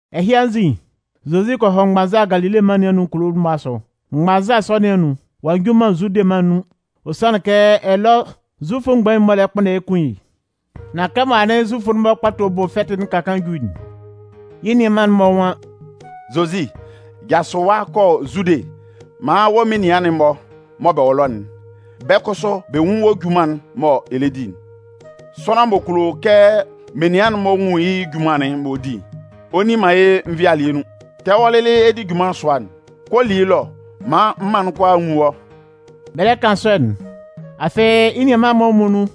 Ɛhɩ anzin, Zozi kɔ hɔ mgbanza Galile mân nɩn anun kulo'n-mɔ asʋ. Mgbanza sɔ nɩn anun, ɔ'a nju man Zude mân nun, ɔ sanlɩn kɛ ɛlɔ Zufʋ mgbain'n-mɔ lɛ kpʋnndɛ yɩ́ kun yɩ́. Nan kɛmɔ anɩn Zufʋ'n-mɔ Kpato Bʋ Fɛtɩ'n ka kaan ju'n, yɩ́ nianman'n-mɔ nwan: “Zozi, jasʋ ɛwa kɔ Zude maan wɔ́ menian'n-mɔ mɔ bɛ wɔ ɛlɔ'n, bɛ́ kʋsʋ bɛ nwún wɔ́ junman'n mɔ ɛ lɛ di'n. Sʋanlan m'ɔ kulo kɛ menian'n-mɔ nwun yɩ́ junman'n m'ɔ di'n, ɔ nni man yɩ́ nvɩalɩɛ nun. Kɛ wɔ́ lɩlɩ ɛ di junman sʋa'n, kɔ li yɩ́ ɛlɔ maan mân'n kʋalaa nwún wɔ́.” Bɛ lɛ kan sɔ'n, afɩ yɩ́ nianman'n-mɔ muonun,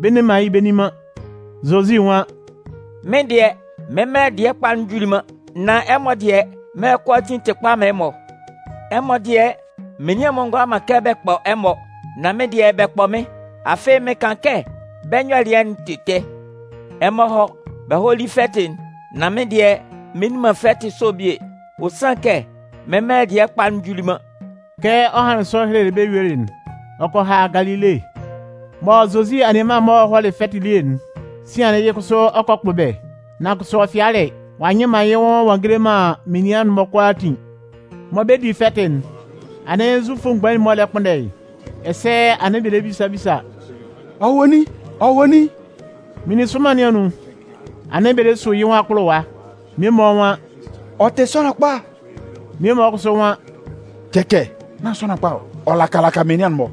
bɛ nne man yɩ́ bɛ nni man. Zozi nwan: “Mɩ́n dɩɛ, mɩ́n mɛlɛ dɩɛ kpa'n juli man, nan ɛmɔ dɩɛ, mɛlɛ kʋalaa tɩ kpa man ɛmɔ. Ɛmɔ dɩɛ, menian'n-mɔ ngʋala man kɛ bɛ kpɔ ɛmɔ, nan mɩ́n dɩɛ, bɛ kpɔ mɩ́n. Afɩ mɩn kan kɛ bɛ́ nyɔlɩɛ'n tɩ ɛtɛ. Ɛmɔ hɔ́, bɛ hɔ́ li fɛtɩ'n, nan mɩ́n dɩɛ, mɩn nni man fɛtɩ sɔ'n bie. Ɔ sanlɩn kɛ mɩ́n mɛlɛ dɩɛ kpa'n juli man.” Kɛ ɔ hanlɩn sɔ helelɩ bɛ́ yuelɩ'n, ɔ kɔ ha Galile. Mɔ Zozi anianman'n-mɔ hɔlɩ fɛtɩ elie'n, sian'n yɩ́ kʋsʋ ɔ kɔ kpʋ bɛ́. Nan kʋsʋ ɔ fɩalɩ. Ɔ'a nyɩ man yɩ́ nwʋn ɔ'a ngele man menian'n-mɔ kʋalaatin. Mɔ bɛ 'di fɛtɩ'n, anɩn Zufʋ mgbain'n-mɔ lɛ kpʋnndɛ yɩ́. Ɛsɛ anɩn bɛ lɛ bisa bisa: “Ɔ wɔ nin? Ɔ wɔ nin?” Meninsʋnman nɩn anun, anɩn bɛ lɛ su yɩ́ nwʋn akpʋlʋwa. Mmie-mɔ nwan: “Ɔ tɩ sʋanlan kpa.” Mmie-mɔ kʋsʋ nwan: “Cɛcɛ, nán sʋanlan kpa ɔ, ɔ lɛ laka laka menian'n-mɔ.”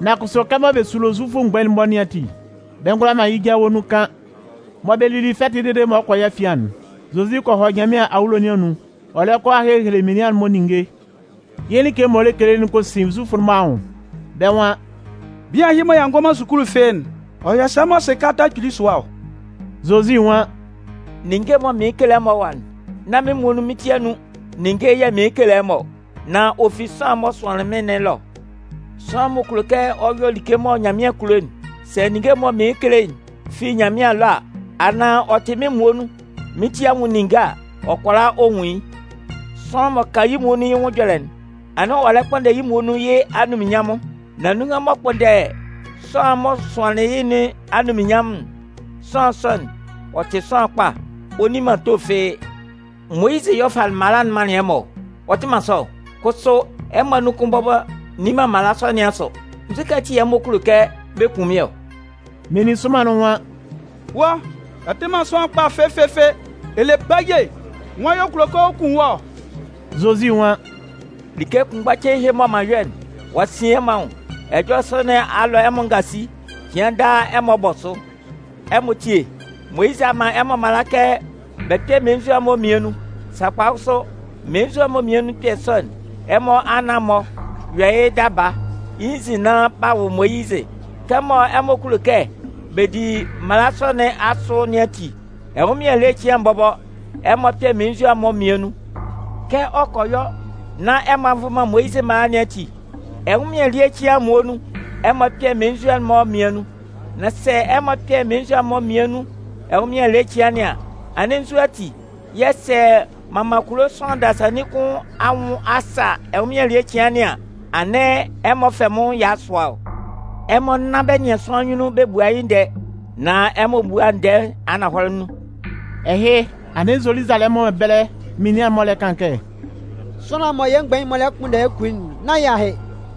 Nan kʋsʋ kɛmɔ bɛ sulo Zufʋ mgbain'n-mɔ nɩn ati, bɛ ngʋala man yɩ́ jawe nun kan. Mɔ bɛ lili fɛtɩ'n dede mɔ ɔ 'kɔ yɩ́ afian'n, Zozi kɔ hɔ Nyanmɩan awulo nɩn anun ɔ lɛ kɔ a hehele menian'n-mɔ ninnge. Yɩ́ like'n m'ɔ lɛ kele'n kɔ sin Zufʋ'n-mɔ anwʋn, bɛ́ nwan: “Bian ɛhɩ mɔ ɔ'a ngɔ man sukulu fɩ́ɩ́'n, ɔ yɔ sɛ mɔ ɔ sɩ kalata kpili sʋa ɔ?” Zozi nwan: “Ninnge'n mɔ mɩɩn kekele ɛmɔ ɛwa'n, nán mɩ́n muonun mɩ́n ti anun ninnge yɛ̂ mɩɩn kekele ɛmɔ ɔ, nan ɔ fi sʋanlan'n mɔ ɔ'a sʋan mɩ́n nɩn ɛlɔ. Sʋanlan m'ɔ kulo kɛ ɔ yɔ like mɔ Nyanmɩan kulo'n, sɛ ninnge'n mɔ mɩɩn kele'n fi Nyanmɩan ɛlɔ a, anaan ɔ tɩ mɩ́n muonun mɩ́n ti anwʋn ninnge a, ɔ kʋala ɔ nwun yɩ́. Sʋanlan m'ɔ kan yɩ́ muonun yɩ́ nwʋn ɛjɔlɛ'n, anɩn ɔ lɛ kpʋnndɛ yɩ́ muonun yɩ́ anunminnyanmʋn. Nan nunhan m'ɔ kpʋnndɛ sʋanlan'n m'ɔ sʋanlɩn yɩ́ nɩn anunminnyanmʋn'n, sʋanlan sɔ'n, ɔ tɩ sʋanlan kpa. Ɔ nni man ato fɩ́ɩ́. Moyizɩ yɛ̂ ɔ falɩ mala'n manlɩn ɛmɔ ɔ. Ɔ tɩ man sɔ ɔ? Kʋsʋ ɛmɔ anun kʋn bɔbɔ nni man mala sɔ nɩn asʋ. Nzu ati yɛ̂ ɛmɔ kulo kɛ bɛ kun mɩ́n ɔ?” Meninsʋnman'n nwan: “Wɔ́, ɛ tɩ man sʋanlan kpa fɩfɩfɩ, ɛ le baye! Nwan yɛ̂ ɔ kulo kɛ ɔ kun wɔ́ ɔ?” Zozi nwan: “Like kʋnmgba cein ɛhɩ mɔ m'an yɔ'n, ɔ'a sin ɛmɔ anwʋn. Ɛjɔlɛ sɔ nɩn a lɔ ɛmɔ ngasi. Cɩan daa ɛmɔ bɔ sʋ. Ɛmɔ tíe, Moyizɩ a man ɛmɔ mala kɛ bɛ kpɛ́ mmelenzua'n-mɔ mmian nun. Sakpa kʋsʋ, mmelenzua mmian nun ɛkpɛ sɔ'n, ɛmɔ anan-mɔ yɔ yɩ́ daba yɩ́ nzin nán b'a wʋ Moyizɩ. Kɛmɔ ɛmɔ kulo kɛ bɛ di mala sɔ nɩn asʋ nɩn ati, ɛnwʋnmɩan ele cɩan'n bɔbɔ, ɛmɔ kpɛ mmelenzua'n-mɔ mmian nun. Kɛ ɔ kɔ yɔ nán ɛmɔ a nvʋn man Moyizɩ mala nɩn ati, ɛnwʋnmɩan ele cɩan'n muonun ɛmɔ kpɛ mmelenzua'n-mɔ mmian nun. Nan sɛ ɛmɔ kpɛ mmelenzua mmian nun ɛnwʋnmɩan ele cɩan nɩn an, anɩn nzu ati yɛ̂, sɛ m'an man kulo sʋanlan dasannin kʋn anwʋn a sa ɛnwʋnmɩan ele cɩan nɩn an, anɩn ɛmɔ fɛ mɩ́n nwʋn ɛya sʋa ɔ? Ɛmɔ nán bɛ nɩan sʋanlan anyunnun bɛ bua yɩ́ ndɛɛ, nan ɛmɔ búa ndɛɛ ananhɔlɛ nun.” Ɛhɩ, anɩn Zoluzalɛmʋn ɛbɛlɛ menian mmie-mɔ lɛ kan kɛ: “Sʋanlan'n mɔ yɛ́ mgbain'n-mɔ lɛ kpʋnndɛ yɩ́ bɛ kun yɩ́'n, nán yɩ́ ahɩ?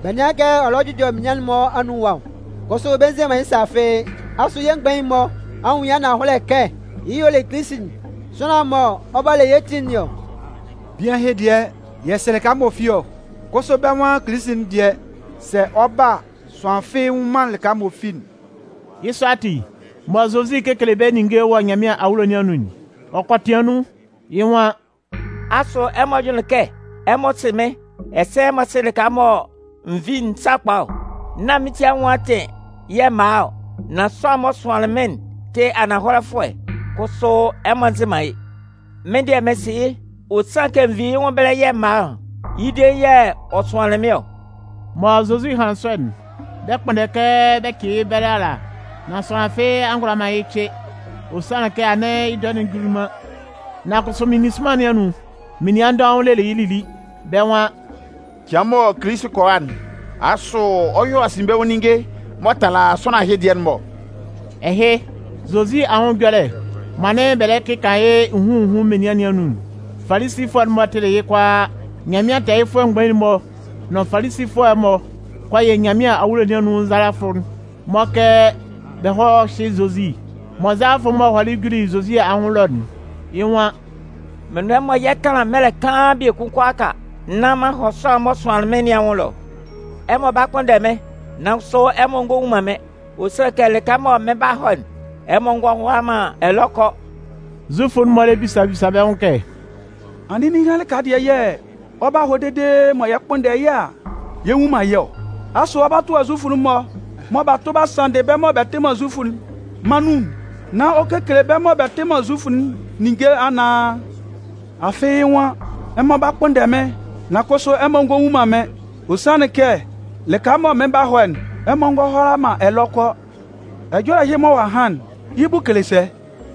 Bɛ nɩ́an kɛ ɔ lɛ jʋjɔ menian'n-mɔ anun ɛwa ɔ, kʋsʋ bɛ nze man yɩ́ sa fɩ́ɩ́. Asʋ yɛ́ mgbain'n-mɔ a nwun yɩ́ ananhɔlɛ kɛ yɩ́ y'ɔ le Kilisi'n, sʋanlan'n mɔ ɔ 'ba le yɛ́ ti nɩn ɔ? Bian ɛhɩ dɩɛ, yɛ sɩ lɩka m'ɔ fi ɔ. Kʋsʋ bɛ́ nwan Kilisi'n dɩɛ, sɛ ɔ 'ba a, sʋanlan fɩ́ɩ́ nnwun man lɩka m'ɔ fi'n.” Yɩ́ sɔ ati, mɔ Zozi 'kekele bɛ́ ninnge wɔ Nyanmɩan awulo nɩn anun'n, ɔ kɔ tɩan nun, yɩ́ nwan: “Asʋ ɛmɔ jʋnlɩn kɛ ɛmɔ sɩ mɩ́n ɛsɛ ɛmɔ sɩ lɩka mɔ n vi'n sakpa ɔ? Nán mɩ́n ti anwʋn atɩn yɛ̂ m'an a ɔ, nan sʋanlan'n m'ɔ sʋanlɩn mɩ́n'n tɩ ananhɔlɛfʋɛ. Kʋsʋ ɛmɔ nzɩ man yɩ́. Mɩ́n dɩɛ mɩn sɩ yɩ́, ɔ sanlɩn kɛ n vi yɩ́ nwʋn ɛbɛlɛ yɛ̂ m'an a ɔ. Yɩ́ dein yɛ̂ ɔ sʋanlɩn mɩ́n ɔ.” Mɔ Zozi hanlɩn sɔ'n, bɛ 'kpʋnndɛ kɛ bɛ cɩ yɩ́ ɛbɛlɛ ala. Nan sʋanlan fɩ́ɩ́ a ngʋala man yɩ́ cɩ, ɔ sanlɩn kɛ anɩn yɩ́ dɔɛ'n juli man. Nan kʋsʋ meninsʋnman nɩn anun, menian dɔʋn lelɩ yɩ́ lili. Bɛ́ nwan: “Cɩan mɔ Kilisi'n kɔ a'n, asʋ ɔ 'yɔ asinbɛnwʋn ninnge m'ɔ tala sʋanlan ɛhɩ dɩɛ'n-mɔ ɔ?” Ɛhɩ, Zozi anwʋn ɛjɔlɛ'n mɔ anɩn bɛ lɛ kɩkan yɩ́ nhun nhun menian nɩn anun'n, Falisifʋɛ'n-mɔ tɩlɩ yɩ́ kʋalaa. Nyanmɩan tɛɛyɩfʋɛ mgbain'n-mɔ nʋn Falisifʋɛ'n-mɔ kɔ yɩ Nyanmɩan awulo nɩn anun nzalafʋ'n-mɔ kɛ bɛ hɔ́ hyɩ́ Zozi. Mɔ nzalafʋ'n-mɔ hɔlɩ juli Zozi anwʋn ɛlɔ'n, yɩ́ nwan: “Mɩn nʋn ɛmɔ yɛ 'tanlan mɛlɛ kaan biekun kʋalaaka nán m'an hɔ sʋanlan'n m'ɔ sʋanlɩn mɩ́n nɩn anwʋn ɛlɔ. Ɛmɔ 'ba kpʋnndɛ mɩ́n, nan kʋsʋ, ɛmɔ ngɔ nwun man mɩ́n. Ɔ sanlɩn kɛ lɩka mɔ mɩn 'ba hɔ'n, ɛmɔ ngɔ hʋala man ɛlɔ kɔ.” Zufʋ'n-mɔ lɛ bisa bisa bɛ́ nwʋn kɛ: “Anɩn ninhan lɩka dɩɛ yɛ̂ ɔ 'ba hɔ dede mɔ yɛ kpʋnndɛ yɩ́ a, yɛ nnwun man yɩ́ ɔ? Asʋ ɔ 'ba tʋa Zufʋ'n-mɔ mɔ b'a tʋ b'a sanndɩ bɛ́ mɔ bɛ tɩ man Zufʋ'n mân nun'n nán ɔ kekele bɛ́ mɔ bɛ tɩ man Zufʋ'n ninnge anaan? Afɩ yɩ́ nwan: ‘Ɛmɔ 'ba kpʋnndɛ mɩ́n, nan kʋsʋ, ɛmɔ ngɔ nwun man mɩ́n. Ɔ sanlɩn kɛ lɩka mɔ mɩn 'ba hɔ'n, ɛmɔ ngɔ hʋala man ɛlɔ kɔ.’ Ɛjɔlɛ ɛhɩ mɔ ɔ'a han'n, yɩ́ bʋ kele sɛ?”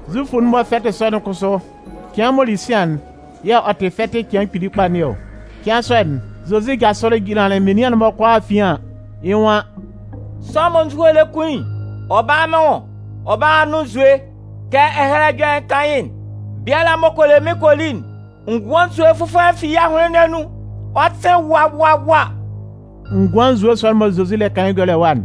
Zufʋ'n-mɔ fɛtɩ sɔ'n kʋsʋ, cɩan m'ɔ li sian'n yɛ̂ ɔ tɩ fɛtɩ'n cɩan kpili kpa nɩn ɔ. Cɩan sɔ'n, Zozi jasʋlɩ jinlanlɩn menian'n-mɔ kʋalaa afian an, yɩ́ nwan: “Sʋanlan mɔ nzuhoe lɛ kun yɩ́'n, ɔ bála mɩ́n nwʋn ɔ bála a nʋn nzue. Kɛ Ɛhɛlɛ Ɛjɔlɛ'n kan yɩ́'n, biala m'ɔ kɔ le mɩ́n kɔ li'n, ngʋan nzue fʋfɔlɛ fi yɩ́ ahʋnlɩn nɩn anun ɔ 'sɩn wa wa wa.” Ngʋan nzue sɔ'n mɔ Zozi lɛ kan yɩ́ ɛjɔlɛ ɛwa'n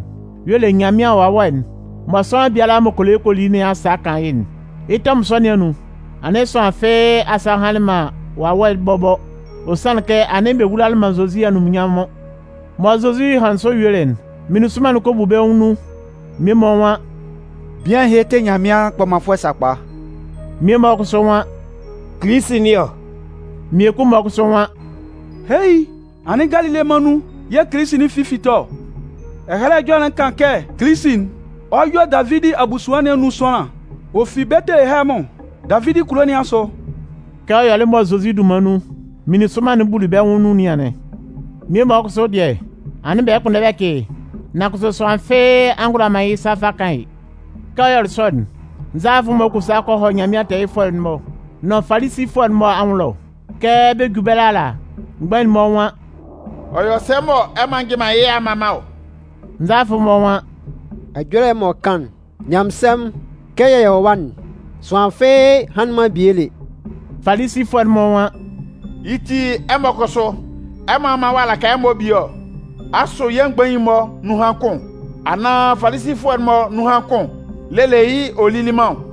y'ɔ le Nyanmɩan Wawɛ'n mɔ sʋanlan biala m'ɔ kɔ le yɩ́ kɔ li nɩn asa 'kan yɩ́'n. Yɩ́ tɛmʋn sɔ nɩn anun, anɩn sʋanlan fɩ́ɩ́ asa hanlɩn man Wawɛ'n bɔbɔ. Ɔ sanlɩn kɛ anɩn bɛ wulalɩ man Zozi anunminnyanmʋn. Mɔ Zozi hanlɩn sɔ yuelɩ'n, meninsʋnman'n kɔ bu bɛ́ nwʋn nun. Mmie-mɔ nwan: “Bian ɛhɩ tɩ Nyanmɩan kpɔmanfʋɛ'n sakpa.” Mmie-mɔ kʋsʋ nwan: “Kilisi nɩn ɔ!” Mmiekun-mɔ kʋsʋ nwan: “Heei! Anɩn, Galile mân nun yɛ̂ Kilisi'n fi 'fite ɔ? Ɛhɛlɛ Ɛjɔlɛ'n kan kɛ Kilisi'n, ɔ 'yɔ Davidi abusuan nɩn anun sʋanlan, ɔ fi Betelehɛmʋn, Davidi kulo nɩn asʋ.” Kɛ ɔ yɔlɩ mɔ Zozi dunman nun, meninsʋnman'n buli bɛ́ nwʋn nun nɩn anɩn. Mmie-mɔ kʋsʋ dɩɛ, anɩn bɛ lɛ kpʋnndɛ yɩ́ bɛ cɩ yɩ́, nan kʋsʋ sʋanlan fɩ́ɩ́ a ngʋala man yɩ́ sa fa kan yɩ́. Kɛ ɔ yɔlɩ sɔ'n, nzalafʋ'n-mɔ kɔ sa kɔ hɔ Nyanmɩan tɛɛyɩfʋɛ'n-mɔ nʋn Falisifʋɛ'n-mɔ anwʋn ɛlɔ. Kɛ bɛ 'ju ɛbɛlɛ ala, mgbain'n-mɔ nwan: “Ɔ yɔ sɛ mɔ ɛmɔ a njɩ man yɩ́ a mma man ɔ?” Nzalafʋ'n-mɔ nwan: “Ɛjɔlɛ'n m'ɔ kan'n, nyanmɩnsɛmʋn, kɛ yɛ wɔ ɛwa'n, sʋanlan fɩ́ɩ́ hanlɩn man bie lé.” Falisifʋɛ'n-mɔ nwan: “Yɩ́ ti, ɛmɔ kʋsʋ, ɛmɔ a man ɔ'a laka ɛmɔ bie ɔ? Asʋ yɛ́ mgbain'n-mɔ nunhan kʋn anaan Falisifʋɛ'n-mɔ nunhan kʋn lelɩ yɩ́ ɔ lili man ɔ?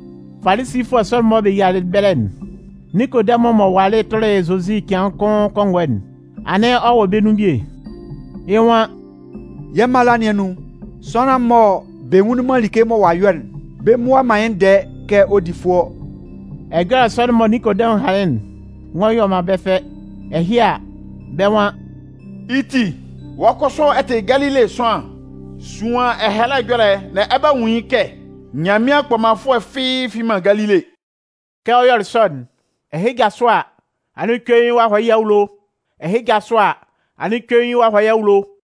Falisifʋɛ sɔ'n-mɔ mɔ bɛ yialɩ ɛbɛlɛ'n, Ninkodɛmʋn m'ɔ walɩ tʋlɩ Zozi cɩan kʋn kɔngɔɛ'n, anɩn ɔ wɔ bɛ́ nun bie. Yɩ́ nwan: “Yɛ́ mala nɩn anun, sʋanlan mɔ bɛ nwunlin man like mɔ ɔ'a yɔ'n, bɛ mmua man yɩ́ ndɛɛ kɛ ɔ di fʋɔ ɔ.” Ɛjɔlɛ sɔ'n mɔ Ninkodɛmʋn hanlɩn'n ngɔ yɔ man bɛ́ fɛ. Ɛhɩ a, bɛ́ nwan: “Yɩ́ ti, wɔ́ kʋsʋ wɔ́ ɛ tɩ Galile sʋanlan? Suan Ɛhɛlɛ Ɛjɔlɛ'n nán ɛ 'ba nwun kɛ Nyanmɩan kpɔmanfʋɛ fɩ́ɩ́ fi man Galile.” [ Kɛ ɔ yɔlɩ sɔ'n, ɛhɩ jasʋ a, anɩn cuein ɔ'a hɔ yɩ́ awulo, ɛhɩ jasʋ a, anɩn cuein ɔ'a hɔ yɩ́ awulo.